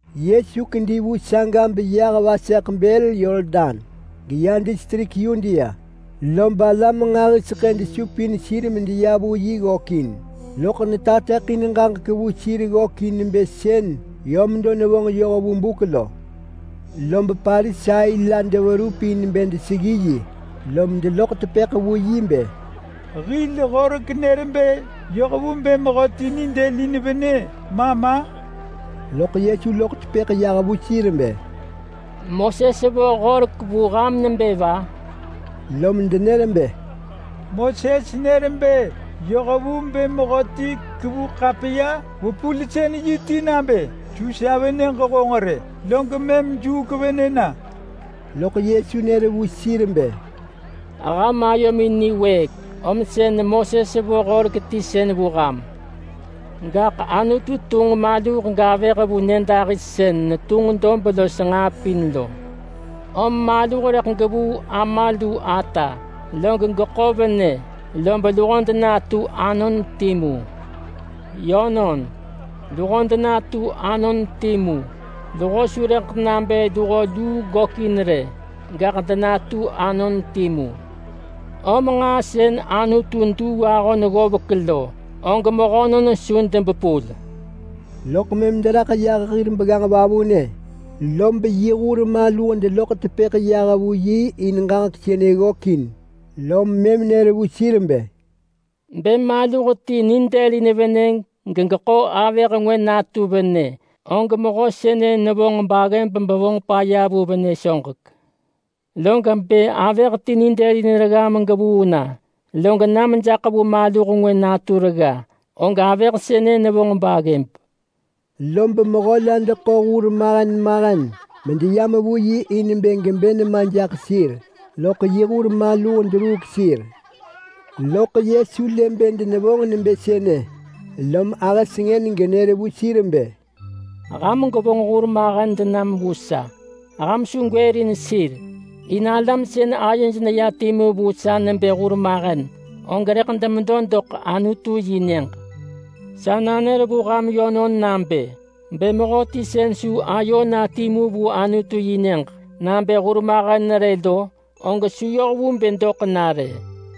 Yesu kedi vu saga beyah vaseḳ bël Yordan geya distrik Yudea, lob alam nġahiseḳë desupin sir medeya vu yi ggökin, loḳ netateḳin ġaġek vu sir ggökin nebë sën yö medo nevonġ yoh vu buk lo. Lob Parisai la deverup in bë deseggi yi, lom deloḳ tepëḳ vu yi bë, “Hil horek nër bë yoh vu bë mehöti nidëlin venë ma ma?” Loḳ Yesu loḳ tepëḳ yah vu sir bë, “Moses vo horek vu ham nebë va?” Lom denër bë, “Moses nër bë yoh vu bë mehöti kevu ḳapiya-vepulsën-yi ti nabë ‘Su sa venëġ honġ rë!’, log mëm juuk venë na.” Loḳ Yesu nër vu sir bë, “Ham ayomin niwëëk, om sën Moses vo horek ti sën vu ham. Gaḳ Anutu tunġ maluh gavëh vu nyëdahis sën netunġ dob los nġaa pin lo. Om maluh rëḳ gevuu ama lu ata, log geḳo venë, lob luho denatu anon timu. Yönon, luho denatu anon timu. Luho su rëḳ nabë luho luu gökin rë, gaḳ denatu anon timu. Om nġaa sën Anutu duu ahon ggovek lo, og mehönon su debepul.” Loḳ mëm deraḳ yah hir begganġ vavunë, lob yi hur maluh deloḳ tepëḳ yah vu yi in ġaġek sënë ggökin. Lom mëm nër vu sir bë, “Bë maluh ti nidëlin venë gegeḳo avëh ngwë natu venë, og mehö sënë nevonġ baggëb bevonġ paya vu venë soġek. Log bë avëh ti nidëlin regga megevuu na, log na mejaḳ vu maluh ngwë natu regga, og avëh sënë nevonġ baggëb.” Lob mehö la deḳo hurmahen mahen medeyam vu yi in bë gebë nema jaḳ sir, loḳ yi hur maluh deruuk sir. Loḳ Yesu lë bë denevonġ nebë sënë, lom ahë sengën genër vu sir bë, “Ham gwevonġ hurmahen denam vu sa, ham su gwërin sir! In alam sën ayoj neyam timu vu sa nebë hurmahen, og rëḳ demedo doḳ Anutu-yi-nyëġ. Sa nanër vu ham yönon nabë: Bë mehöti sën su ayo na timu vu Anutu-yi-nyëġ nabë hurmahen rë lo, og su yoh vu bë doḳ na rë.”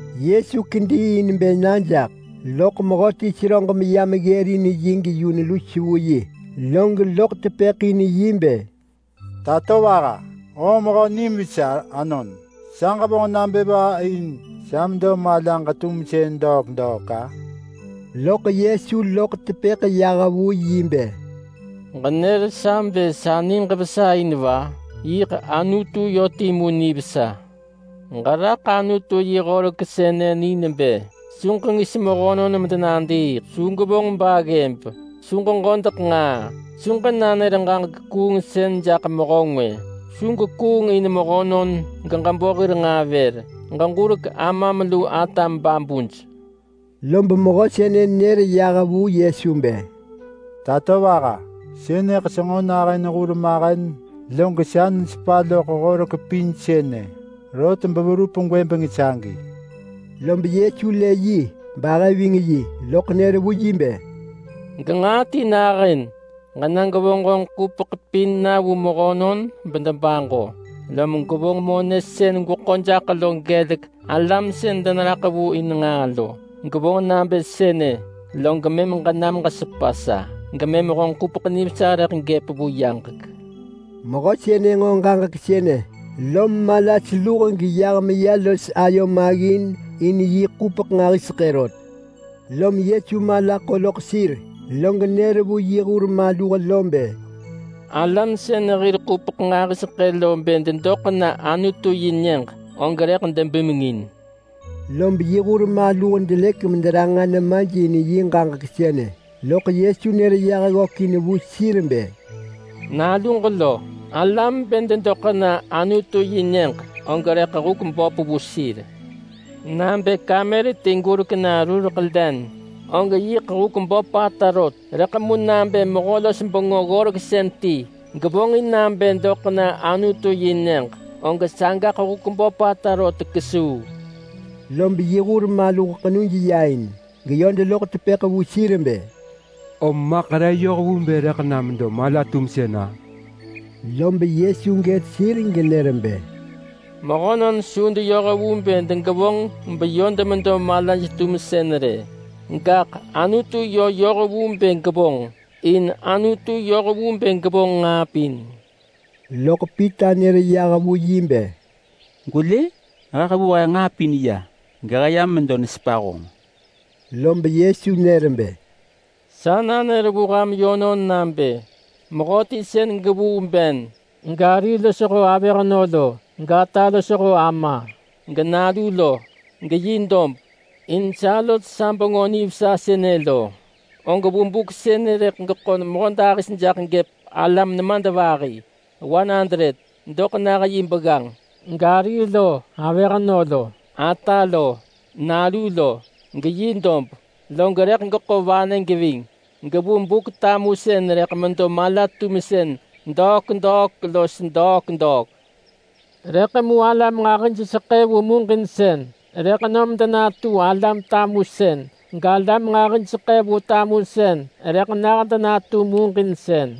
Yesu kedi in bë na jaḳ, loḳ mehöti seröġ meyam ggërin yi geyun lus vu yi, log loḳ tepëḳ in bë, “Tatovaha! Honġ mehö nim vesa anon! Sa ġevonġ nabë va in sa medo malaġ-tumsën degwata los degwata?” Loḳ Yesu loḳ tepëḳ yah vu yi bë, “Ġënër sa bë sa niġ vesa in va? Yiḳ Anutu yö timu nivesa! Ġeraḳ Anutu yi horek sënë ni nebë: Su ġengis mehönon medenadiiḳ! Su gwevonġ baggëb! Su ġeġodeḳ nġaa! Su ġenanër ġaġek kuungsën jaḳ mehö ngwë! Su gwekuung in mehönon geġebo hir nġaa vër! Ġeġurek amam lu atam babuj!” Lob mehö sënë nër yah vu Yesu bë, “Tatovaha! Sënëḳ senġo nahën hurmahen log sa nesepa loḳ horek pin sënë, rot beverup gwëbeng sagi.” Lob Yesu lë yi bahë ving yi, lob nër vu yi bë, “Genġaa ti nahën! Ġena gwevonġ honġ ḳupeḳ pin na bemehönon debaġo, lob gwevonġ monë sën gweḳo jaḳ lo na vu alam sën deneraḳ vu in nġaa lo. Gwevonġ nabë sënë, log mëm ġenam ġesepa sa, gemëm honġ ḳupeḳ nivesa rëḳ gëp vu yaġek.” Mehö sënë nġo ġaġek sënë, lom mala seluh geyah meya los ayo maggin in yi ḳupeḳ nġahiseḳë rot. Lom Yesu mala ḳo loḳ sir, log nër vu yi hur maluh bë, “Alam sën hir ḳupeḳ nġahiseḳë lo bë dedoḳ na Anutu-yi-nyëġ, og rëḳ debimengin.” Lob yi hur maluh delëk mederanġa nemaj in yi ġaġek sënë, loḳ Yesu nër yah ggökin vu sir bë, “Naluġ lo! Alam bë dedoḳ na Anutu-yi-nyëġ, og rëḳ huk böp vu sir. Nabë kamer ti gurek na rureḳ len, og yiḳ huk böpata rot, rëḳ mu nabë mehö-los-bengö-ggoreksën ti gevonġin nabë doḳ na Anutu-yi-nyëġ, og sagaḳ huk böpata rot kesuu.” Lob yi hur maluh ḳenuj ya in, geyö deloḳ tepëḳ vu sir bë, “Om maḳ re yoh vu bë rëḳ na medo mala-tumsën-a?” Lob Yesu gët sir genër bë, “Mehönon su deyoh vu bë degevonġ beyö demedo malaj-tumsën rë, gaḳ Anutu yö yoh vu bë gevonġ. In Anutu yoh vu bë gevonġ nġaa pin.” Loḳ Pita nër yah vu yi bë, “Gwelë! He hevuu he nġaa pin ya gehë yam medo nesepa honġ!” Lob Yesu nër bë, “Sa nanër vu ham yönon nabë mehöti sën gevuu ben gari losho avëhnö lo, gata losho ama genalu lo geyi dob, in sa los sa Bengö Nivesa sënë lo, og vu buk sënë rëḳ geḳo mehödahis jaḳ gëp alam nemadvahi doḳ nah yi begganġ gari lo avëhnö lo, ata lo nalu lo, geyi dob. Log rëḳ geḳo vanë geving, gevu Buk-tamusën rëḳ medo mala-tumsën degwata los degwata. Rëḳ mu alam nġahijseḳë vu muġinsën, rëḳ nom denatu alam tamusën, galam nġahijseḳë vu tamusën rëḳ nah denatu muġinsën.”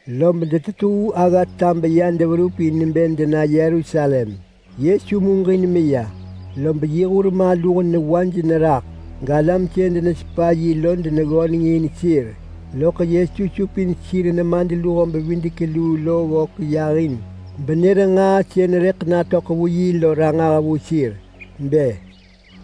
Lob detetuu aggata beya deverup in bë dena Yerusalem. Yesu muġin meya, lob yi hur maluh newaj neraḳ, galam sën denesepa yi lo deneggöneng in sir. Loḳ Yesu supin sir nemadluho-bevidek-luu lo ggök yahin benër nġaa sën rëḳ natöḳ vu yi lo ranġah vu sir. Bë,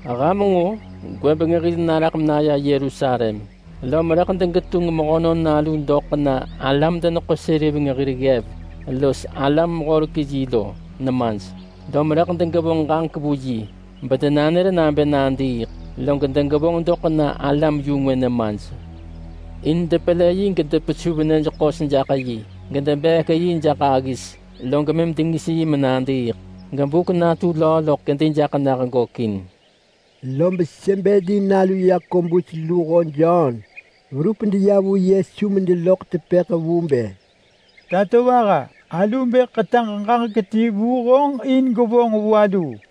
“Ham nġo! Gwëbeng hil naraḳ menaya Yerusalem, lom mëm rëḳ degetunġ Mehönon Nalu doḳ na alam-deneḳo-seriveng hir ggev lo los alam-horek-yi lo nemaj, lom rëḳ degevonġ ġaġek vu yi bedenanër nabë nadiiḳ, log degevonġ doḳ na alam-yu-ngwë nemaj in depelë yi gedepesuv nyëj ḳos jaḳ yi gedebeek yi jaḳ aggis, log mëm dengis yi menadiiḳ. Gebuk natu löö loḳ kedi jaḳ nah gökin.” Lob Sebedi nalu Yakobus luho Jon verup deya vu Yesu medeloḳ tepëḳ vu bë, “Tatovaha! Alu bë ḳetaġ ġaġek ti vu honġ in gwevonġ vu aluu.”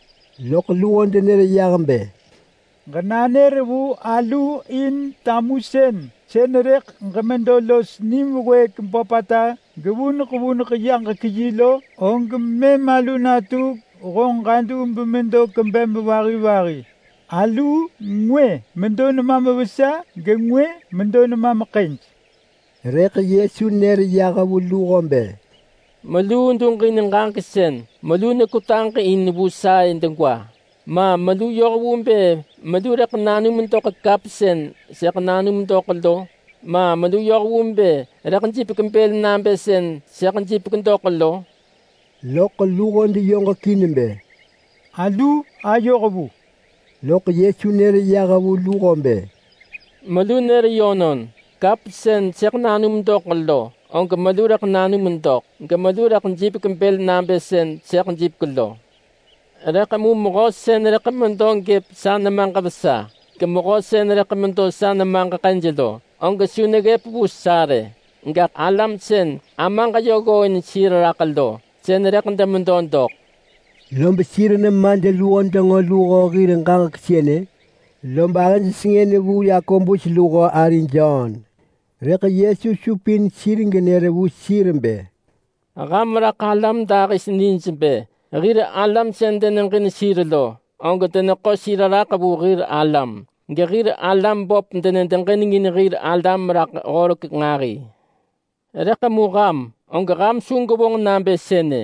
Loḳ luho denër yah bë, “Ġenanër vu aluu in tamusën sën rëḳ ġemedo los nim wëëk böpata gevuneḳ vuneḳ yaġek yi lo, og mëm alu natu honġ ġadu bemedo kwebem vahi vahi. Aluu ngwë medo nemam vesa, gengwë medo nemam ḳëj.” Rëḳ Yesu nër yah vu luho bë, “Meluu duġin ġaġek sën melu nekwetaġ in vu sa-ë degwa! Ma melu yoh vu bë melu rëḳ nanum doḳ kap sën sëḳ nanum doḳ lo? Ma melu yöh vu bë rëḳ jipek bël nabë sën sëḳ jipek doḳ lo?” Loḳ luho deyoġekin bë, “Alu ayoh vu!” Lob mëm Yesu nër vu luho bë, “Melu nër yönon! Kap sën sëḳ nanum doḳ lo, og melu rëḳ nanum doḳ, gemelu rëḳ jipek bël nabë sën sëḳ jipek lo. Rëḳ mu mehö sën rëḳ medo gëp sa nemaġ vesa, gemehö sën rëḳ medo sa nemaġ ḳëj lo, og su neggëp vu sa rë. Gaḳ alam sën Amaġ yö ggooin sir raḳ lo, sën rëḳ demedo doḳ.” Lob sir nemadluho denġo luho hir ġaġek sënë, lob ahëj sengën vu Yakobus luho ari Jon. Rëḳ Yesu supin sir genër vu sir bë, “Ham raḳ alam dahis nij bë hir alam sën deneġin sir lo, og deneḳo sir raḳ vu hir alam, gehir alam böp denedeġinengin hir alam raḳ horek nġahi. Rëḳ mu ham, og ham su gwevonġ nabë sënë.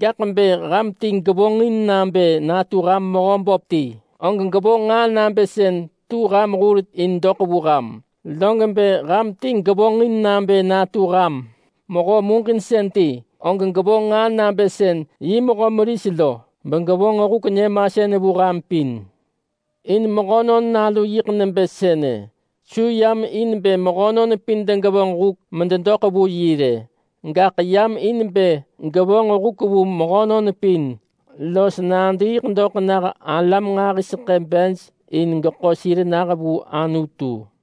Gaḳ bë ham ti gevonġin nabë natu ham mehö böp ti, og gevonġ nġaa nabë sën tu ham hur in doḳ vu ham, log bë ham ti gevonġin nabë natu ham mehö muġinsën ti, og gevonġ nġaa nabë sën yi mehö meris lo, begevonġ huk nyëmasën vu ham pin. In Mehönon Nalu yiḳ nebë sënë. Su yam in bë mehönon pin degevonġ huk mededoḳ vu yi rë, gaḳ yam in bë gevonġ huk vu mehönon pin los nadiiḳ doḳ nah alam nġahiseḳë bej in geḳo sir nah vu Anutu.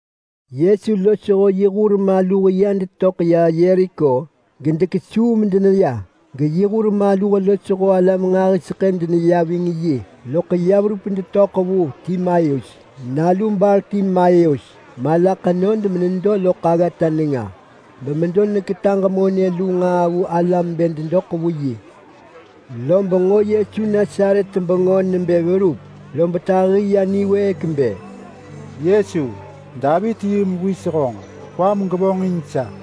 Yesu losho yi hur maluh ya detöḳ ya Yeriko gedekesuu medeneya. Geyi hur maluh losho alam nġahiseḳë deneya ving yi. Loḳ ya verup detöḳ vu Timaius nalu Bartimaius mala ḳenod menedo loḳ aggata nenga, bemedo neketaġ monë lu nġaa vu alam bë dedoḳ vu yi. Lob nġo Yesu Nasaret bengö nebë verup, lob tahi ya niwëëk bë, “Yesu! Davit-yi-mewis honġ! Kwam gevonġin sa!”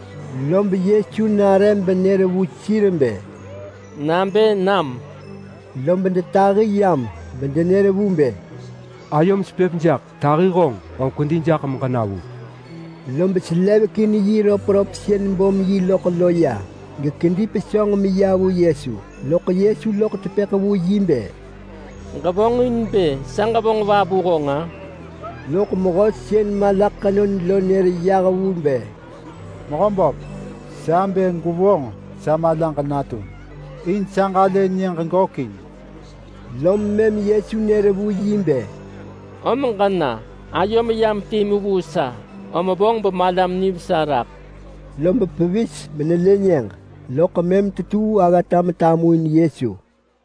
Lob Yesu nare benër vu sir bë, “Nabë nam!” Lob detahi yam bedenër vu bë, “Ayom sepëp jaḳ! Tahi honġ, om kwedi jaḳ meġena vu!” Lob selevekin yi röpröp sën bom yi loḳ lo ya, gekedi pesönġ meya vu Yesu. Loḳ Yesu loḳ tepëḳ vu yi bë, “Ġevonġin bë sa ġevonġ va vu honġ-a?” Loḳ mehö sën mala ḳenod lo nër yah vu bë, “Mehöböp! Sa bë gwevonġ sa malaġ natum in sa ġalë nyëġ gökin!” Lom mëm Yesu nër vu yi bë, “Om ġena! Ayom yam timu vu sa, om vonġ bemalam nivesa raḳ!” Lob pevis menelë nyëġ, loḳ mëm tetuu aggata metamuin Yesu.